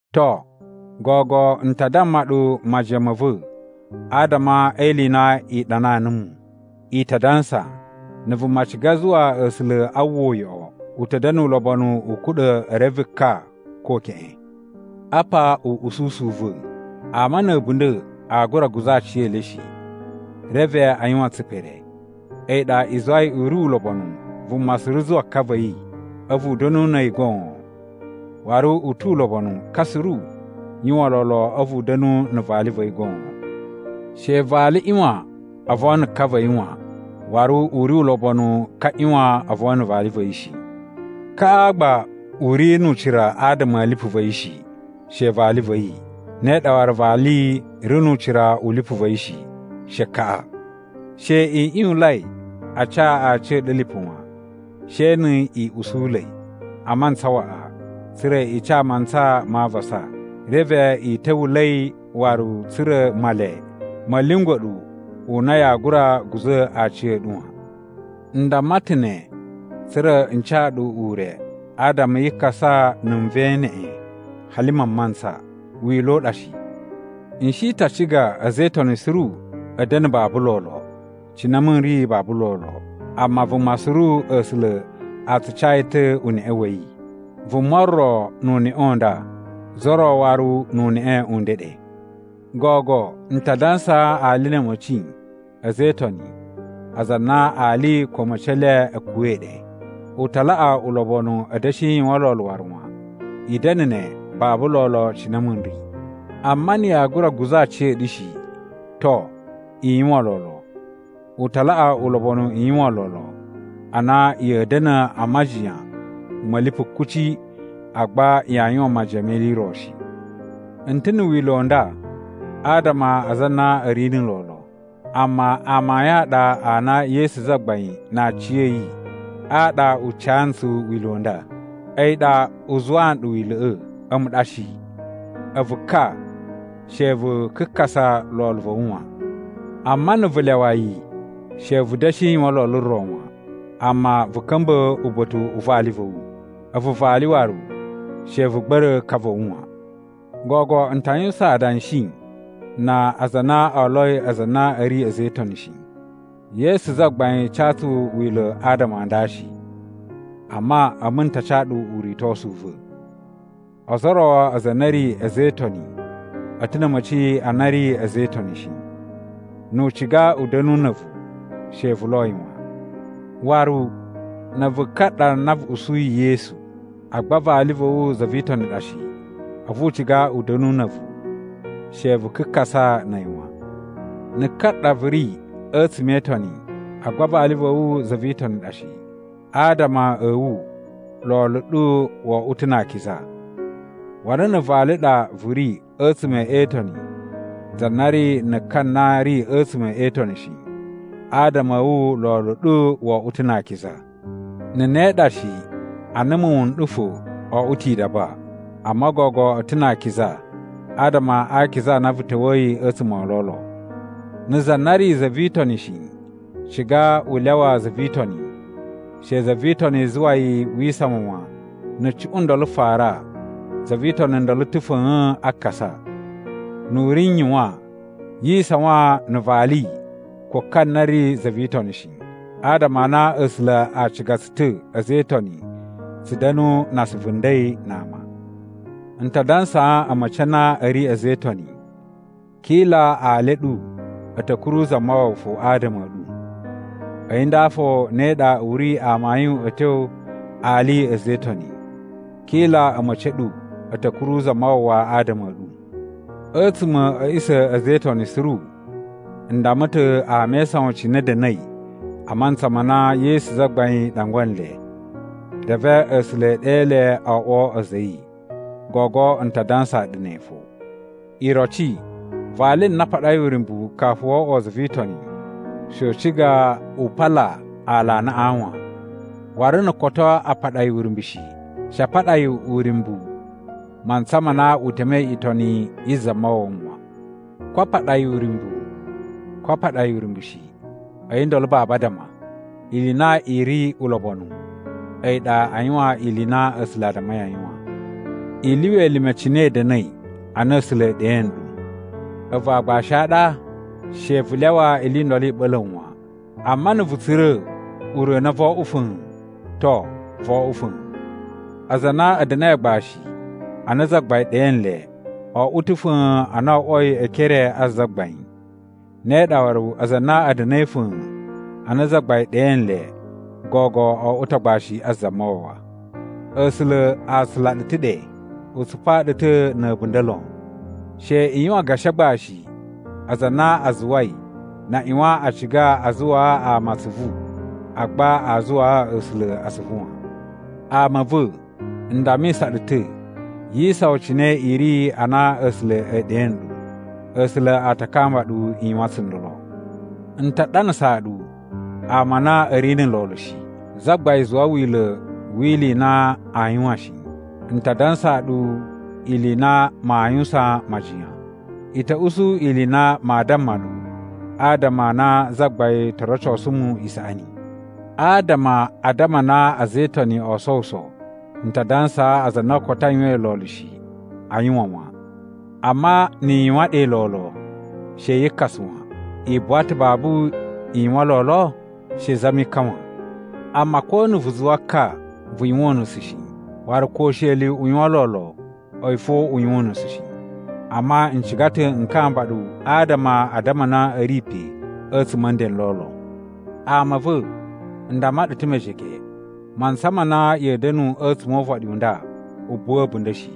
To, gogo n ta damma ɗu majiyan ma̱ va̱ adama e ili i na i ɗanaa numu. I ta dansa, “Na̱ vuma ciga zuwa A̱sula̱ a uwwa uyoꞌo, u ta̱ da̱na̱ ulobonu u kuɗa̱ e reve ka ko keꞌen.” Apa uꞌususu u va̱: Ama na̱ a̱bunda̱ aa gura guza̱ aciyele shi, reve a yuwan tsipere. A̱yi ɗa i zuwai u ri ulobonu vuma suru zuwa ka va̱ yi a̱vu u da̱nu na̱ a̱yi goon, waru u tu ulobonu ka suru yuwan lolo a̱vu u da̱nu na̱ vali va̱ yi goon. She vali ꞌyuwan o von na̱ ka va̱ yi wan. Waru, u ri ulobonu ka ꞌyuwan o von na̱ vali va̱ yi shi. Kaꞌa gba u ri nu ucira adama a̱ lipu va̱ yi shi, she vali va̱ yi, ne ɗa waru vali ri nu ucira u lipu va̱ yi shi, she kaꞌa. She i ꞌyuwunlai a ca aciya̱ɗu lipu wan, she ni i usula̱i a mantsa waꞌa tsa̱ra̱ i ca mantsa ma avasa. Reve i ta̱wula̱i waru tsa̱ra̱ Male ma̱ lyungwa̱ ɗu u na yaa gura guza̱ aciya̱ɗu wan. N damma ta̱ ne tsa̱ra̱ n ca ɗu ure adama yi kasa na̱ nven neꞌen hali mamantsa. Wila̱ u ɗa shi. N shi ta ciga a̱za̱ e Itoni suru a̱ da̱na̱ babu lolo, cine a̱mu n ri babu lolo. Amma vuma suru A̱sula̱ a tsu ca yi ta̱ uneꞌe wa̱ yi. Vuma ro nu uneꞌe u nda, za ro waru nu uneꞌe u ndeɗe. Gogo n ta dansaa ali na̱ a̱ma̱ci a̱ a̱za̱ e Itoni aza a na ali ko a̱ma̱ci e le a̱ kuwa̱i ɗe. U ta laꞌa ulobonu a̱ da̱shi yuwan lolo waru wan. I da̱na̱ ne babu lolo cine a̱mu n ri. Amma na̱ yaa gura guza̱ aciya̱ɗu shi, to, i yuwan lolo. U ta laꞌa ulobonu i yuwan lolo a na ya̱a̱ da̱na̱ a majiyan ma̱ lipu kuci agba yaa yuwan majiyan me ili i ro shi. N ta̱ na̱ wila̱ u nda adama a aza a na a̱ ri na̱ lolo. Amma amayun a ɗa a na Yesu Zagbain na aciya̱yi a ɗa u ca ntsu wila̱ u nda. A̱yi ɗa u zuwaa nɗu wila̱ꞌa̱, a̱mu ɗa shi. A̱vu ka, she vu kakasa lolo va̱ wu wan. Amma na̱ vu lyawa yi, she vu da̱shi yuwan lolo ro wan, amma vu ka̱mba̱ uba̱ta̱ u vali va̱ wu. A̱vu vali waru, she vu gba̱ra̱ ka va̱ wu wan. Gogo n ta yuwusan adanshi na aza a na oloi aza a na a̱ ri a̱za̱ e Itoni shi. Yesu Zagbain ca tsu wila̱ adama a nda shi, amma a̱mu n ta ca ɗu uritosu u va̱. Ozo o ro aza a na a̱ ri a̱za̱ e Itoni a̱ ta̱ na̱ a̱ma̱ci a na a̱ ri a̱za̱ e Itoni shi. Nu u ciga u da̱nu na̱ a̱vu, she vu lo yi wan. Waru, na̱ a̱vu ka ɗa na vu usuyi Yesu, agba vali va̱ wu za vi Itoni ɗa shi, a̱vu u ciga u da̱nu na̱ a̱vu, she vu kakasa na̱ a̱yi wan. Na̱ ka ɗa vu ri a̱tsuma̱ e Itoni, agba vali va̱ wu za vi Itoni ɗa shi, adama a̱ wu lolo ɗu wo oꞌwo ta̱ na akiza. Waru na̱ vali ɗa vu ri a̱tsuma̱ e Itoni za na ri na̱ ka na ri a̱tsuma̱ e Itoni shi, adama a̱ wu lolo ɗu wo oꞌwo ta̱ na akiza. Na̱ ne ɗa shi a na muwun n ɗu fo o oꞌwo ta̱ idaba, amma gogo a̱ ta̱ na akiza adama a akiza a na vu ta̱wa̱yi a̱tsuma̱ o lolo. Na̱ za na ri za vi Itoni shi ciga u lyawa za vi Itoni, she za vi Itoni zuwa yi wi isawan wan. Na̱ cuꞌun ndolo fara, za vi Itoni ndolo ta̱ fa̱a̱n a kasa. Nu u ri n yuwan, yi isawan na̱ vali ko ka na ri za vi Itoniꞌi shi, adama a na A̱sula̱ a ciga tsu ta̱ a̱za̱ e Itoni tsu da̱nu na asuvu nden na ama. N ta dansaa a̱ma̱ci a na a̱ ri a̱za̱ e Itoni: Kila ali a̱ ɗu a̱ ta̱ kuru Zamawawa fo adama a̱ ɗu. A̱yi nda fo ne ɗa u ri amayun a̱ tyo ali a̱za̱ e Itoni: Kila a̱ma̱ci a̱ ɗu a̱ ta̱ kuru Zamawawa adama a̱ ɗu. A̱tsuma̱ a̱ a̱ꞌisa̱ a̱ a̱za̱ e Itoni suru n damma ta̱ ama e isawan cine a̱ da̱na̱i a mantsa ma na Yesu Zagbain ɗangwa nle, reve A̱sula̱ e ɗe le o oꞌwo a̱za̱ a̱ yi. Gogo n ta dansaa ɗu ne fo. Iroci, vali na a paɗai uryumbu kafu wo oꞌwo za vi Itoni, she u ciga u pala aalanaꞌa wan. Waru, na̱ koto a paɗa yi uryumbu shi, she a paɗa yi uryumbu mantsa ma na u temei itoni yi Zamawawa wan. Ko a paɗa yi uryumbu ko a paɗa yi uryumbu shi, a̱yi ndolo babu addama. Ili i na i ri ulobonu a̱yi ɗa a yuwan ili i na A̱sula̱ a dammai a yuwan. I lyuwa elime cine i da̱na̱i ana A̱sula̱ e ɗe nɗu. A̱vu aagbashi a ɗa? She vu lyawa ili i ndolo i ɓa̱la̱ wu wan. Amma na̱ vu tsura̱ ure u na voo oꞌwo fa̱a̱n, to, vo oꞌwo fa̱a̱n. Aza a na a̱ da̱na̱i agbashi ana Zagbain ɗe nle, o oꞌwo ta̱ fa̱a̱n ana o oꞌwoi e ekere a Zagbain. Ne ɗa waru, aza a na a̱ da̱na̱i fa̱a̱n ana Zagbain ɗe nle, gogo o oꞌwo ta̱ agbashi a Zamawawa. A̱sula̱ a tsula ɗu ta̱ ɗe. U tsupaa ɗu ta̱ na̱ a̱bunda̱ lon. She i yuwan gashi agbashi aza a na a zuwai na ꞌyuwan a ciga a zuwaa ama atsuvu agba a zuwaa A̱sula̱ atsuvu wan. Ama a̱ va̱, n dammisa ɗu ta̱, yi isawan cine i ri ana A̱sula̱ e ɗe nɗu, A̱sula̱ a ta kamba ɗu i yuwan tsundolo. N ta ɗanasaa ɗu ama a na a̱ ri na̱ lolo shi. Zagbain zuwa wila̱ wi ili i na aa yuwan shi, n ta dansaa ɗu ili i na maa yuwusan majiyan. I ta̱ usu ili i na maa damma ɗu adama a na Zagbain to rocosu mu isaꞌani. Adama a addama a na a̱za̱ e Itoni o sowuso, n ta dansaa aza a na koto a yuwain lolo shi a yuwan wan. Amma ni i yuwan ɗe lolo, she yi kasa wan. I buwa ta̱ babu i yuwan lolo? She i zami ka wan. Amma ko na̱ vu zuwa ka, vu yuwan unusu shi. Waru ko usheli u yuwan lolo, a̱yi fo u yuwan unusu shi. Amma n ciga ta̱ n kamba ɗu adama a addama a na a̱ ri pe a̱tsuma̱ a̱ nden n lolo. Ama a̱ va̱, n damma ɗu ta̱ mejege, mantsa ma na ya̱a̱ da̱nu a̱tsuma̱ o uvaɗi u nda u buwa a̱bunda̱ shi.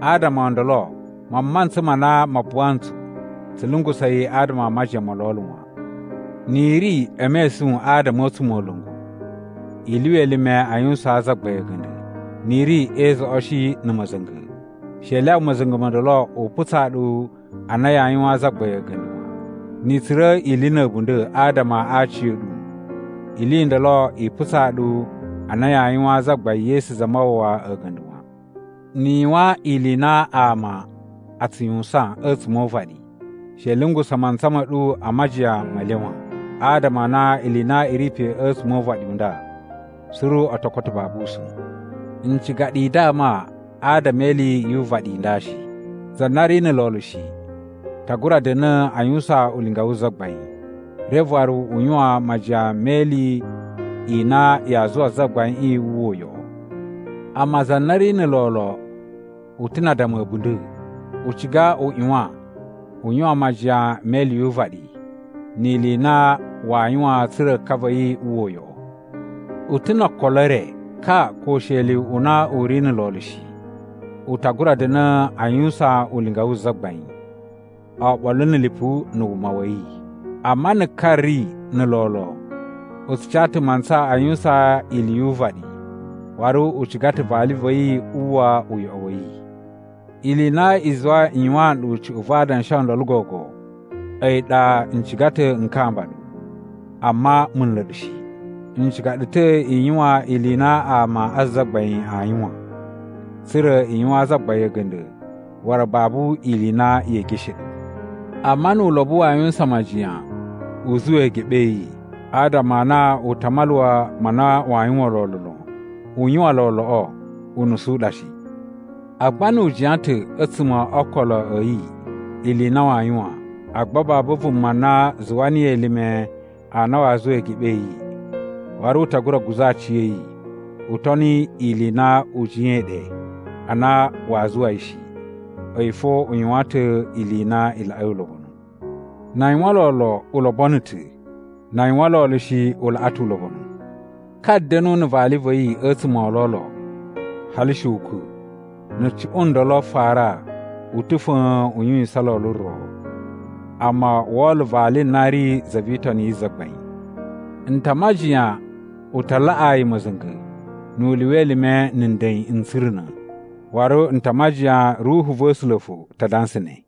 Adama o ndolo mamantsa ma na ma buwa ntsu, tsu lungusa̱ yi adama a majiyan mo lolo wan. Ni i ri e mesun adama a̱ a̱tsumola̱ngu, i lyuwa elime a yuwusaan Zagbain a̱ga̱nda̱. Ni i ri e izoꞌoshi na̱ ma̱za̱nga̱, she i lyawa ma̱za̱nga̱ mo ndolo u putsaa ɗu a na yaa yuwaan Zagbain a̱ga̱nda̱ wan. Ni i tsura̱ ili na̱ a̱bunda̱ adama a aciya̱ɗu, ili i ndolo i putsaa ɗu a na yaa yuwaan Zagbain Yesu Zamawawa a̱ga̱nda̱ wan. Ni i yuwan ili i na ama a tsu yuwusan a̱tsuma̱ o uvaɗi, she i lungusa̱ mantsa ma̱ ɗu a majiyan me le wan, adama a na ili i na i ri pe a̱tsuma̱ o uvaɗi u nda suru o to koto babu usa̱n. N ciga ɗu i dama adama e ili yu uvaɗi i nda shi. Za na ri na̱ lolo shi, ta gura da̱na̱ a yuwusan ulinga wu Zagbain, reve waru u yuwan majiyan me ili i na yaa zuwa Zagbaiꞌin wu uwwa uyoꞌo. Amma za na ri na̱ lolo u ta̱ na addama a̱ a̱bunda̱. U ciga u ꞌyuwan, u yuwan majiyan me ili yu uvaɗi, ni ili i na waa yuwan tsa̱ra̱ ka va̱ yi uwwa uyoꞌo. U ta̱ no okolo e re. Ka ko usheli u na u ri na̱ lolo shi, u ta gura da̱na̱ a yuwusan ulinga wu Zagbain, oɓolo na̱ lipu na̱ wuma wa̱ yi. Amma na̱ ka ri na̱ lolo, u tsu ca ta̱ mantsa a yuwusan ili yu uvaɗi waru u ciga ta̱ vali va̱ yi uwwa uyoꞌo wa̱ yi. Ili i na i zuwai n yuwaan ɗu cuꞌun va adanshi o ndolo gogo a̱yi ɗa n ciga ta̱ n kamba ɗu, amma mu nla̱ ɗu shi. N ciga ɗu ta̱ i yuwan ili i na ama a Zagbain aa yuwan, tsa̱ra̱ i yuwaan Zagbain a̱ga̱nda̱ waru babu ili i na yee geshe ɗu. Amma nu ulobo waa yuwusan majiyan u zuwa eegeɓe a̱ yi adama a na u ta maluwa ma na waa yuwan lolo lon, u yuwan loloꞌo, unusu u ɗa shi. Agba nu u jiyan ta̱ a̱tsuma̱ o ookolo a̱ yi ili i na waa yuwan, agba babu vuma na zuwa niyi elime a na waa zuwa eegeɓe a̱ yi, waru u ta gura guza̱ aciya̱yi, u toni ili i na u jiyain ɗe a na waa zuwa yi shi. A̱yi fo u yuwan ta̱ ili i na i laꞌai ulobonu. Na a yuwan lolo, u lobono ta̱. Na a yuwan lolo shi, u laꞌa tu ulobonu. Ka da̱nu na̱ vali va̱ yi a̱tsuma̱ o lolo, hali she ukwa̱. Na̱ cuꞌun ndolo fara u ta̱ fa̱a̱n u yuwisan lolo ro, amma wo olo vali na ri za vi Itoni yi Zagbain. N ta majiyan u ta laꞌaa yi ma̱za̱nga̱ nu u lyuwa elime na̱ nden n tsuruna̱, waru n ta a majiyan Ruhu va̱ A̱sula̱ fo ta dansa ne.